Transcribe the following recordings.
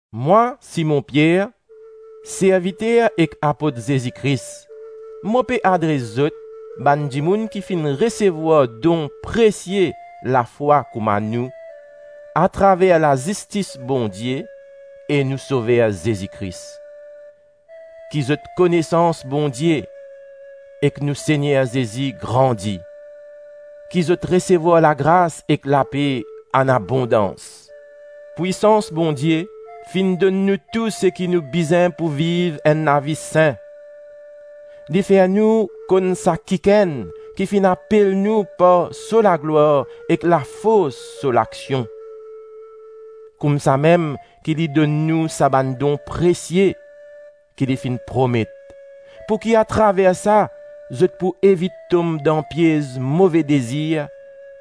Mwa Simon Pier, serviter ek apot Zezi Kris. Mo pe adres zot, bann dimoun ki finn resevwar don presie lafwa kouma nou, atraver lazistis Bondie e nou Sover Zezi Kris: Ki zot konesans Bondie ek nou Segner Zezi grandi, ki zot resevwar lagras ek lape anabondans. Pwisans Bondie finn donn nou tou seki nou bizin pou viv enn lavi sin; li fer nou konn sa kikenn ki finn apel nou par so laglwar ek lafors so laksion. Koumsamem ki li donn nou sa bann don presie ki li finn promet, pouki atraver sa, zot pou evit tom dan piez move dezir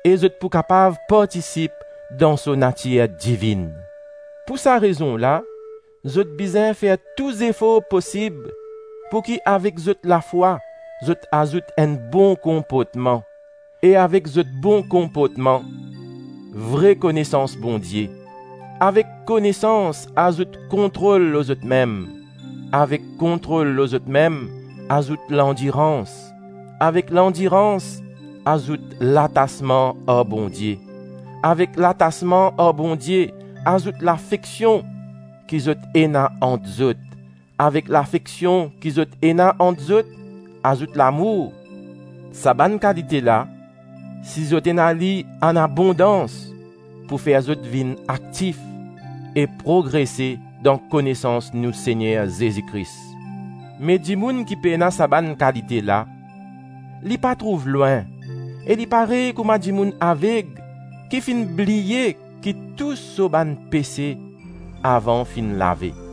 e zot pou kapav partisip dan so natir divinn. Pou sa rezon la, zot bizin fer tou zefor posib pou ki avek zot lafwa zot azout enn bon konportman, e avek zot bon konportman vre konesans Bondie. Avek konesans azout kontrol lor zotmem, avek kontrol lor zotmem azout landirans, avek landirans azout latasman ar Bondie, avek latasman ar Bondie azout lafeksion ki zot ena ant zot, avek lafeksion ki zot ena ant zot azout lamour. Sa bann kalite la, si zot ena li anabondans, pou fer zot vinn aktif e progrese dan konesans nou Segner Zezi Kris. Me dimoun ki pena sa bann kalite la, li pa trouv lwin e li parey kouma dimoun aveg ki finn bliye ki tou so bann pese avan finn lave.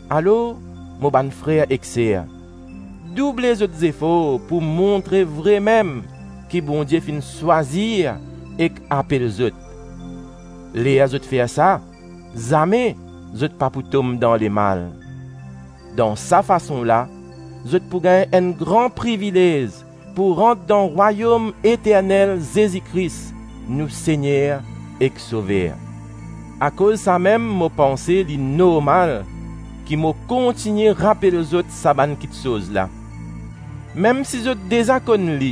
Alor mo bann frer ek ser, double zot zefor pou montre vremem ki Bondie finn swazir ek apel zot; ler zot fer sa, zame zot pa pou tom dan lemal. Dan sa fason la, zot pou gagn enn gran privilez pou rant dan rwayom eternel Zezi Kris nou Segner ek Sover. Akoz samem mo panse li normal ki mo kontigne rapel zot sa bann kitsoz la, mem si zot deza konn li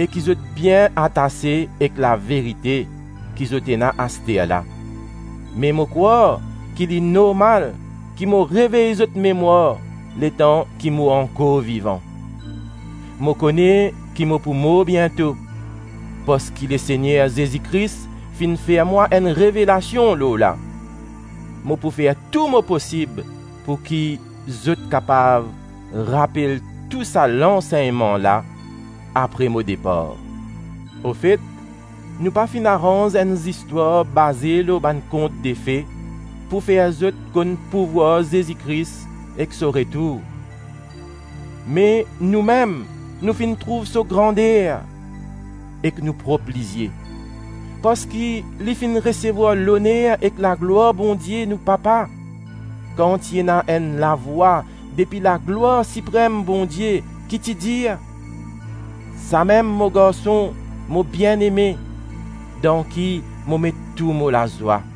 e ki zot bien atase ek laverite ki zot ena asterla. Me mo krwar ki li normal ki mo revey zot memwar letan ki mo ankor vivan. Mo kone ki mo pou mor biento, parski Lesegner Zezi Kris finn fer mwa enn revelasion lor la. Mo pou fer tou mo posib pouki, zot kapav rapel tou sa lansegnman la apre mo depar. Ofet, nou pa finn aranz enn zistwar baze lor bann kontdefe pou fer zot konn pouvwar Zezi Kris ek so retour, me noumem, nou finn trouv so grander ek nou prop lizie. Parski Li finn resevwar loner ek laglwar Bondie nou Papa kan ti ena enn lavwa depi laglwar siprem Bondie, ki ti dir: “Samem mo garson, mo bieneme, dan ki mo met tou mo lazwa.”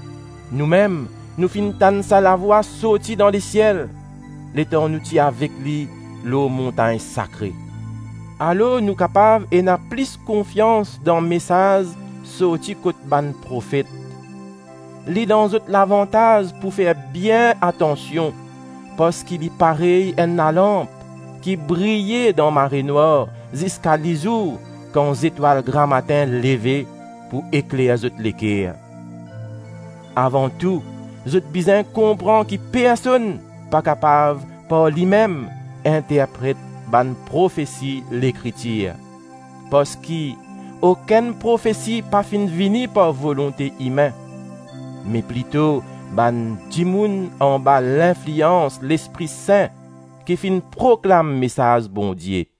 Noumem, nou finn tann sa lavwa sorti dan lesiel, letan nou ti avek li lor montagn sakre. Alor nou kapav ena plis konfians dan mesaz sorti kot bann profet. Li dan zot lavantaz pou fer bien atansion parski li parey enn lalanp ki briye dan marenwar ziska lizour kan zetwal gramatin leve pou ekler zot leker. Avan tou, zot bizin konpran ki personn pa kapav par limem interpret bann profesi Lekritir, parski okenn profesi pa finn vini par volonte imin, me plito bann dimoun anba linflians Lespri Sin ki finn proklam mesaz Bondie.